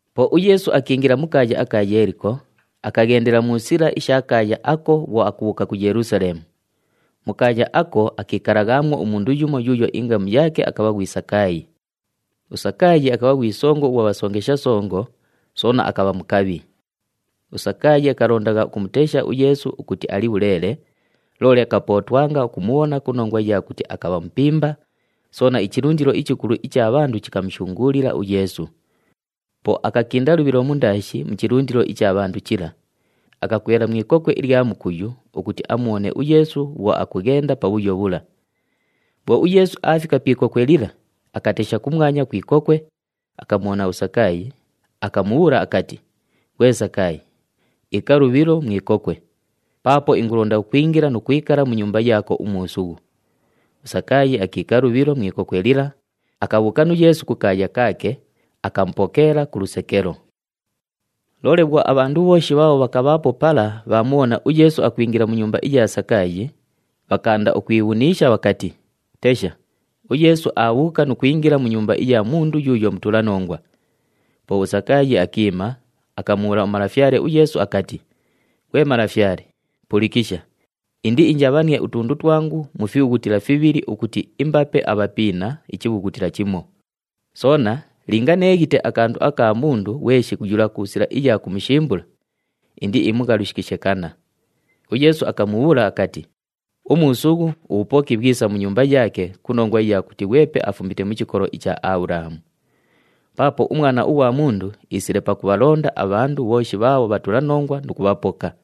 Po uYeesu akiingila mu kaaya aka Yeeliko, akaghendela mu sila isha kaaya ako bhwo akubhuuka ku Yelusaleemu. Mu kaaya ako, akiikalaghaamwo umundu yumo yuuyo ingamu yaake akabha ghwi Sakaayi. USakaayi akabha ghwi songo ughwa bhasongesha songo, soona akabha mukabhi. USakaayi akalondagha ukumutesha uYeesu ukuti ali bhuleele, loole akapootwanga ukumubhona ku nongwa iya kuti akabha mupimba, soona ichilundilo ichikulu icha bhandu chikamushunguulila uYeesu. Po akakinda lubhilo mundaashi mu chilundilo icha bhandu chila, akakwela mu ikokwe ilya mukuyu ukuti amubhone uYeesu bhwo akughenda pabhuyo bhula. Bhwo uYeesu aafika pi ikokwe lila, akatesha kumwanya ku ikokwe, akamubhona uSakaayi, akamubhuula akati, “Ghwe Sakaayi, iika lubhilo mu ikokwe! Paapo ingulonda ukwingila nu kwikala mu nyumba yaako umuusughu.” USakaayi akiika lubhilo mu ikokwe lila, akabhuuka nu Yeesu kukaaya kaake, akamupokeela ku lusekelo. Loole bhwo abhandu bhooshi bhaabho bhakabhaapo pala bhaamubhona uYeesu akwingila mu nyumba iya Sakaayi, bhakaanda ukwibhuniisha bhakati, “Tesha, uYeesu aabhuuka nu kwingila mu nyumba iya mundu yuuyo mutulanongwa!” Po uSakaayi akiima, akamubhuula uMalafyale uYeesu akati, “Ghwe Malafyale! Pulikisha, indiinjabhanie utundu twangu mu fibhughutila fibhili ukuti imbape abhapiina ichibhughutila chimo, soona linga neeghite akandu kamu ku mundu ghweshi yula ku sila iya kumushimbula, indiimughalushikishe kanna.” UYeesu akamubhuula akati, “Umuusughu, ubhupoki bhwisa mu nyumba yaake ku nongwa iya kuti ghwepe afumite mu chikolo icha Abhulahamu. Paapo uMwana ughwa Mundu iisile pakubhalonda abhandu bhooshi bhaabho bhatulanongwa nu kubhapoka.”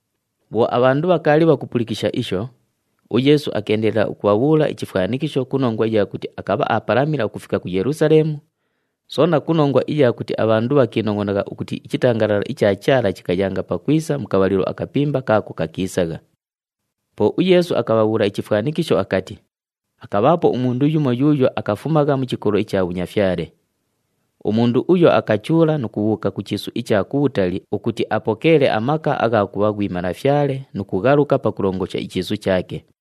Bhwo abhandu bhakaali bhakupulikisha isho, uYeesu akeendelela ukubhabhuula ichifwanikisho ku nongwa iya kuti akabha aapalamila ukufika ku Yelusaleemu, soona ku nongwa iya kuti abhandu bhakiinongʼonagha ukuti ichitangalala icha Chaala chikayanga pakwisa mu kabhalilo akapimba kaako kakiisagha. Po uYeesu akabhabhuula ichifwanikisho akati, “Akabhaapo umundu yumo yuuyo akafumagha mu chikolo icha bhunyafyale. Umundu uyo akachuula nu kubhuuka ku chiisu icha kubhutali ukuti apokeele amaka agha kubha ghwi malafyale nu kughaluka pakulongosha ichiisu chaake.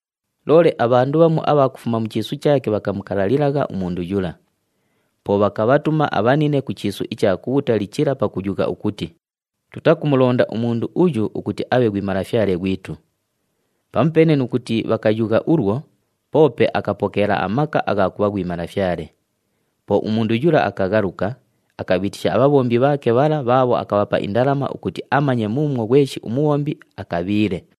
Loole abhandu bhamu abha kufuma mu chiisu chaake bhakamukalalilagha umundu yula. Po bhakabhatuma abhanine ku chiisu icha kubhutali chila pakuyugha ukuti, ‘Tutakumulonda umundu uyu ukuti abhe ghwi malafyale ghwitu!’ Pamupeene nu kuti bhakayugha ulwo, poope akapokeela amaka agha kubha ghwi malafyale. Po umundu yula akaghaluka, akabhiitisha abhabhombi bhaake bhala bhaabho akabhapa indalama ukuti amanye muumwo ghweshi umubhombi akabhiile.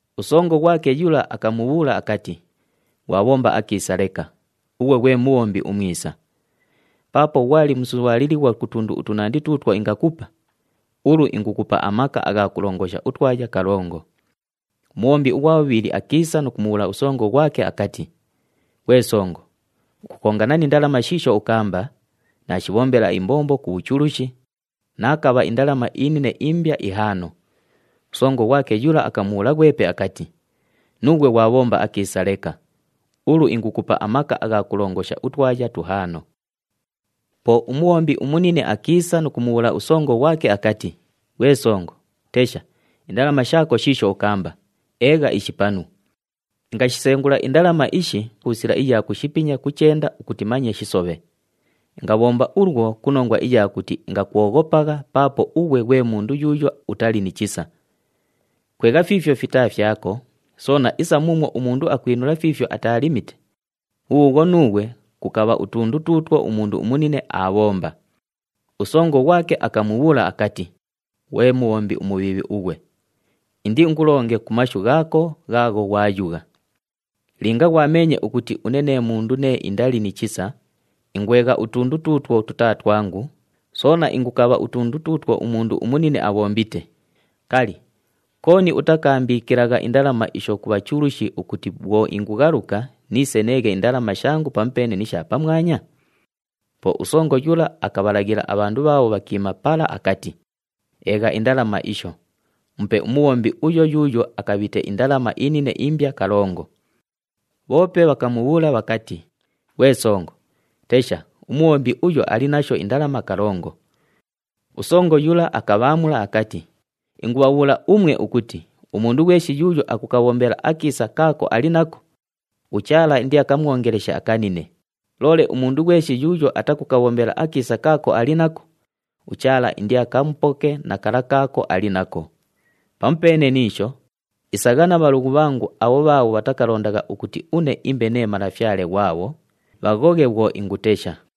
Usongo ghwake yula akamubhuula akati, ‘Ghwabhomba akiisa leka, ughwe ghwe mubhombi umwisa. Paapo ghwali musubhaalilighwa ku tundu utunandi tuutwo ingakupa, ulu ingukupa amaka agha kulongosha utwaya kalongo.’ Umubhombi ughwa bhubhili akiisa nu kumubhuula usongo ghwake akati, ‘Ghwe songo, ukukongana ni ndalama shiisho ukaamba, naashibhombela imbombo ku bhuchulushi, naakabha indalama inine imbya ihaano.’ Usongo ghwake yula akamubhuula ghwepe akati, ‘Nuughwe ghwabhomba akiisa leka, ulu ingukupa amaka agha kulongosha utwaya tuhaano.’ “Po umubhombi umunine akiisa nu kumubhuula usongo ghwake akati, ‘Ghwe songo, tesha, indalama shaako shiisho ukaamba, eegha ishi panu. Ingashisengula indalama ishi ku sila iya kushipinya ku chenda ukuti manye shisobhe. Ingabhomba ulwo ku nongwa iya kuti ingakwoghopagha paapo ughwe ghwe mundu yuuyo utali ni chisa. Kwegha fiifyo fitaa fyako, soona isa muumwo umundu akwinula fiifyo ataalimite, bhubhuubhwo, nuughwe kukabha utundu tuutwo umundu umunine aabhomba.’ Usongo ghwake akamubhuula akati, ‘Ghwe mubhombi umubhiibhi ughwe! Indiingulonge ku mashu ghaako ghaagho ghwayugha. Linga ghwameenye ukuti une nee mundu nee indali ni chisa, ingwegha utundu tuutwo tutaa twangu, soona ingukabha utundu tuutwo umundu umunine abhombite, kali, kooni utakaambiikilagha indalama isho ku bhachulushi ukuti bhwo ingughaluka niise neeghe indalama shangu pamupeene ni sha pamwanya?’ Po usongo yula akabhalaghila abhandu bhaabho bhakiima pala akati, ‘Eegha indalama isho, mupe umubhombi uyo yuuyo akabhite indalama inine imbya kalongo.’ Bhoope bhakamubhuula bhakati, ‘Ghwe songo, tesha, umubhombi uyo ali nasho indalama kalongo!’ Usongo yula akabhaamula akati, ‘Ingubhabhuula umwe ukuti umundu ghweshi yuuyo akukabhombela akiisa kaako ali nako, uChaala indiakamwongeleshe akanine, loole umundu ghweshi yuuyo atakukabhombela akiisa kaako ali nako, uChaala indiakamupoke na kala kaako ali nako. Pamupeene ni isho, isagha na bhalughu bhangu abho bhaabho bhatakalondagha ukuti une imbe nee malafyale ghwabho, bhaghoghe bhwo ingutesha!’”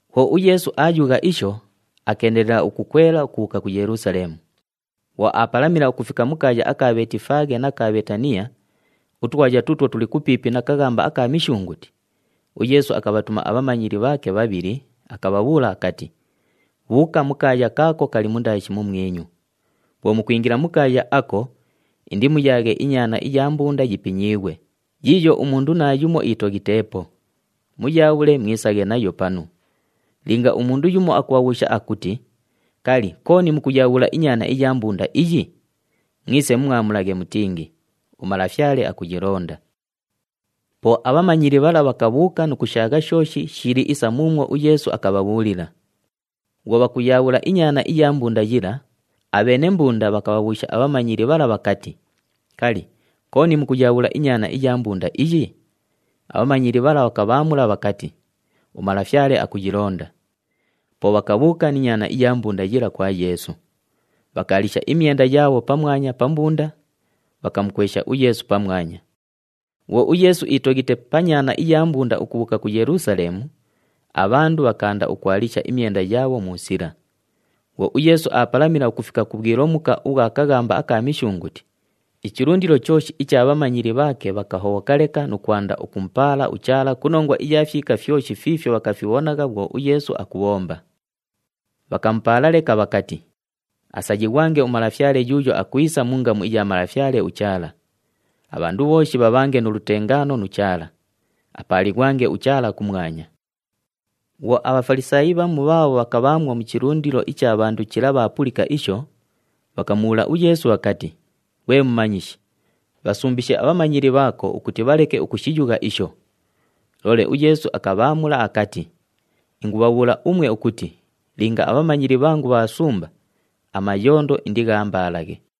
Bhwo uYeesu aayugha isho, akeendelela ukukwela ukubhuuka ku Yelusaleemu. Bhwo aapalamila ukufika mu kaaya aka Bheetifaaghe na ka Bheetaniya, utwaya tuutwo tuli kupiipi na kaghamba aka Mishunguti, uYeesu akabhatuma abhamanyili bhaake bhabhili, akabhabhuula akati, “Bhuuka mu kaaya kaako kali mundaashi mumwinyu. Bhwo mukwingila mu kaaya ako, indimuyaaghe inyaana iya mbunda yipinyiighwe, yiiyo umundu naayumo itoghiteepo. Muyaabhule, mwisaghe nayo panu. Linga umundu yumo akubhabhuusha akuti, ‘Kali, kooni mukuyaabhula inyaana iya mbunda iyi?’ Mwise mumwamulaghe mutingi, ‘UMalafyale akuyilonda.’” Po abhamanyili bhala bhakabhuuka nu kushaagha shooshi shili isa muumwo uYeesu akabhabhuulila. Bhwo bhakuyaabhula inyaana iya mbunda yila, abheene mbunda bhakabhabhuusha abhamanyili bhala bhakati, “Kali, kooni mukuyaabhula inyaana iya mbunda iyi?” Abhamanyili bhala bhakabhaamula bhakati, “UMalafyale akuyilonda.” Po bhakabhuuka ni nyaana iya mbunda yila kwa Yeesu. Bhakaalisha imyenda yaabho pamwanya pa mbunda, bhakamukwesha uYeesu pamwanya. Bhwo uYeesu iitoghite pa nyaana iya mbunda ukubhuuka ku Yelusaleemu, abhandu bhakaanda ukwalisha imyenda yaabho mu sila. Bhwo uYeesu aapalamila ukufika ku bhwilomuka ubhwa kaghamba aka Mishunguti, ichilundilo chooshi icha bhamanyili bhaake bhakahobhoka leka nu kwanda ukumupaala uChaala ku nongwa iya fyika fyoshi fiifyo bhakafibhonagha bhwo uYeesu akubhomba. Bhakamupaala leka bhakati, “Asayighwange uMalafyale yuuyo akwisa mu ngamu iya Malafyale uChaala. Abhandu bhooshi bhabhange nu lutengaano nu Chaala! Apaalighwange uChaala kumwanya.” Bhwo aBhafalisaayi bhamu bhaabho bhakabhaamwo mu chilundilo icha bhandu chila bhaapulika isho, bhakamubhuula uYeesu bhakati, “Ghwe Mumanyishi, bhasumbishe abhamanyili bhaako ukuti bhaleke ukushiyugha isho!” Loole uYeesu akabhaamula akati, “Ingubhabhuula umwe ukuti linga abhamanyili bhangu bhaasumba, amayondo indighambaalaghe!”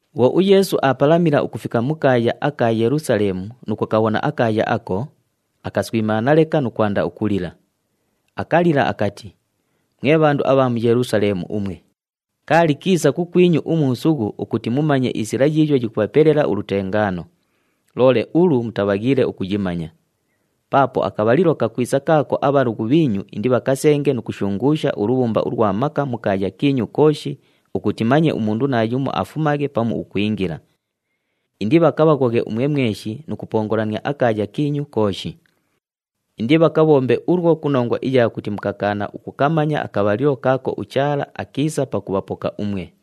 Bhwo uYeesu aapalamila ukufika mu kaaya aka Yelusaleemu nu kukabhona akaaya ako, akaswimaana leka nu kwanda ukulila. Akalila akati, “Mwe bhandu abha mu Yelusaleemu umwe, kaali kiisa kukwinyu umuusughu ukuti mumanye isila yiiyo yikubhapelela ulutengaano. Loole ulu mutabhaghiile ukuyimanya. Paapo akabhalilo kakwisa kaako abhalughu bhiinyu indibhakasenge nu kushunguusha ulubhumba ulwa maka mu kaaya kiinyu kooshi ukuti manye umundu naayumo akafumaghe pamu ukwingila. Indibhakabhaghoghe umwe mweshi nu kupongolania akaaya kiinyu kooshi. Indibhakabhombe ulwo ku nongwa iya kuti mukakaana ukukamanya akabhalilo kaako uChaala akiisa pakubhapoka umwe!”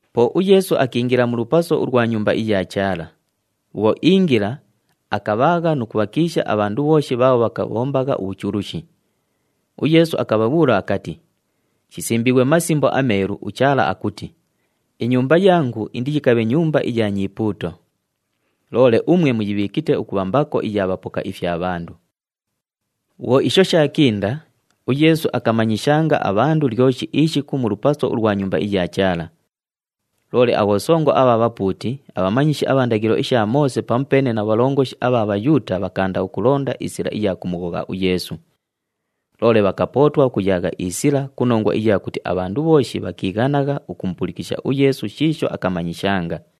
Po uYeesu akiingila mu lupaso ulwa Nyumba iya Chaala. Bhwo iingila, akabhaagha nu kubhakiisha abhandu bhooshi bhaabho bhakabhombagha ubhuchulushi. UYeesu akabhabhuula akati, “Shisimbiighwe mu Masimbo aMeelu, uChaala akuti, ‘Inyumba yangu indiyikabhe nyumba iya nyipuuto.’ Loole umwe muyibhiikite ukubha mbako iya bhapoka ifya bhandu.” Bhwo isho shaakinda, uYeesu akamanyishanga abhandu lyoshi ishiku mu lupaso ulwa Nyumba iya Chaala. Loole abhosongo abha bhapuuti, abhamanyishi abha ndaghilo isha Moose pamupeene na bhalongoshi abha Bhayuuta bhakaanda ukulonda isila iya kumughogha uYeesu. Loole bhakapootwa ukuyaagha isila ku nongwa iya kuti abhandu bhooshi bhakiighanagha ukumupulikisha uYeesu shiisho akamanyishanga.